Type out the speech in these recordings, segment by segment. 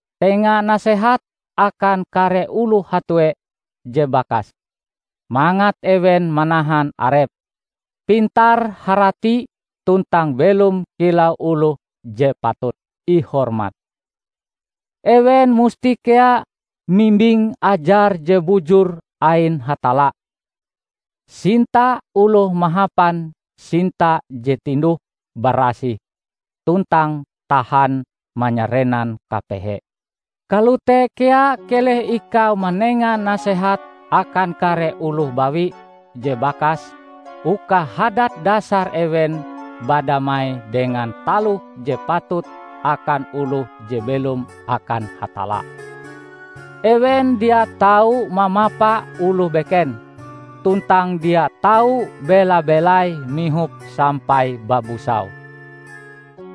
Tenga nasehat akan kare oloh hatue je bakas, mangat ewen manahan arepe, pintar-harati tuntang belom kilau oloh je patut ihormat. Ewen musti kea mimbing ajar je bujur ain Hatalla, sinta oloh mahapan sinta je tinduh-barasih tuntang tahan manyarenan kapehe. Kalote kea keleh ikau manenga nasehat akan kare oloh bawi je bakas uka hadat dasar ewen badamai dengan taloh je patut akan oloh je belom akan Hatalla. Ewen dia tau mamapa oloh beken, tuntang dia tau bela-belai mihop sampai babusau.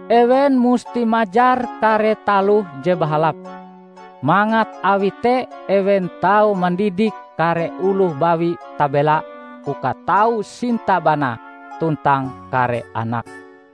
Ewen musti majar kare taloh je bahalap, mangat awi te ewen tau mandidik kare oloh bawi tabela uka tau sinta banae tuntang kare anake,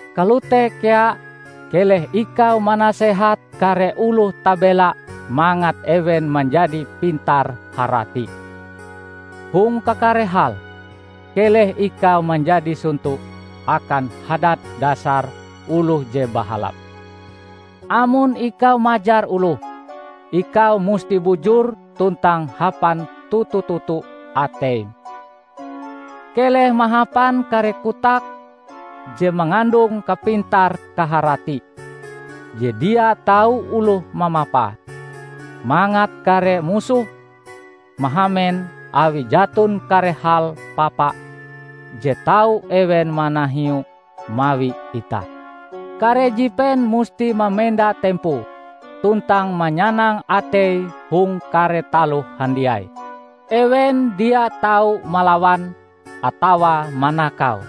Kalote kea, keleh ikau manasehat kare oloh tabela mangat ewen manjadi pintar-harati. Hong kakare hal, keleh ikau manjadi sonto akan hadat dasar oloh je bahalap. Amon ikau majar oloh, ikau musti bujur tuntang hapan toto-toto ateim. Keleh mahapan kare kotak je mangandung kapintar-kaharati, je dia tau oloh mamapae, mangat kare musohm mahamen awi jaton kare hal papa je tau ewen manahiue mawi itah. Kare jipen musti mamenda tempoe, tuntang manyanang ateie hong kare taloh handiai. Ewen dia tau malawan, atawa manakau.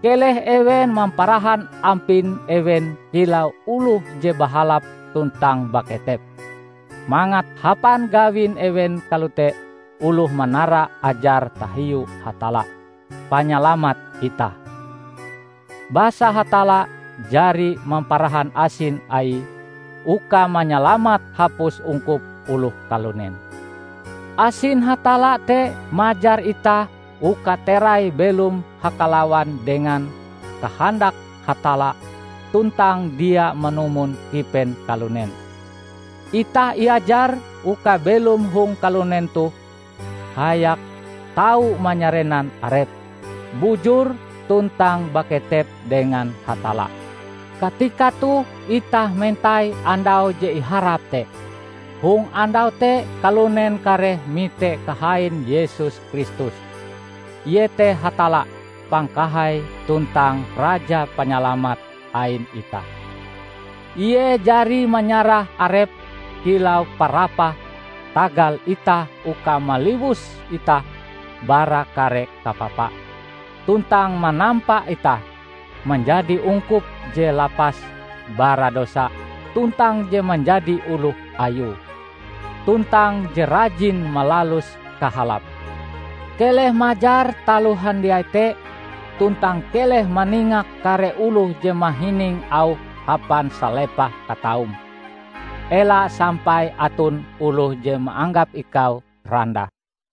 Keleh ewen mamparahan ampin ewen kilau oloh je bahalap tuntang baketep, mangat hapan gawin ewen kalote oloh manara ajar tahiu Hatalla, Panyalamat itah. Basa Hatalla jari mamparahan asin Aie uka manyalamat hapus ungkup oloh kalunen. Asin Hatalla te majar itah uka terai belom hakalawan dengan kahandak Hatalla tuntang dia manumon kipen kalunen. Itah iajar uka belom hong kalunen toh hayak tau manyarenan arep, bujur tuntang baketep dengan Hatalla. Katika toh itah mentai Andau je iharap te; hong Andau te kalunen kareh mite kahain Yesus Kristus, iete Hatalla Pangkahai tuntang Raja Panyalamat ain itah. Ie jari manyarah Arepe kilau parapah tagal itah uka maliwus itah bara kare kapapa, tuntang manampa itah manjadi ungkup je lapas bara dosa tuntang je manjadi oloh Ayue, tuntang je rajin malalus kahalap. Keleh majar taloh handiai te, tuntang keleh maningak kare oloh je mahining auhm hapan salepah kataum. Ela sampai aton oloh je maanggap ikau randah.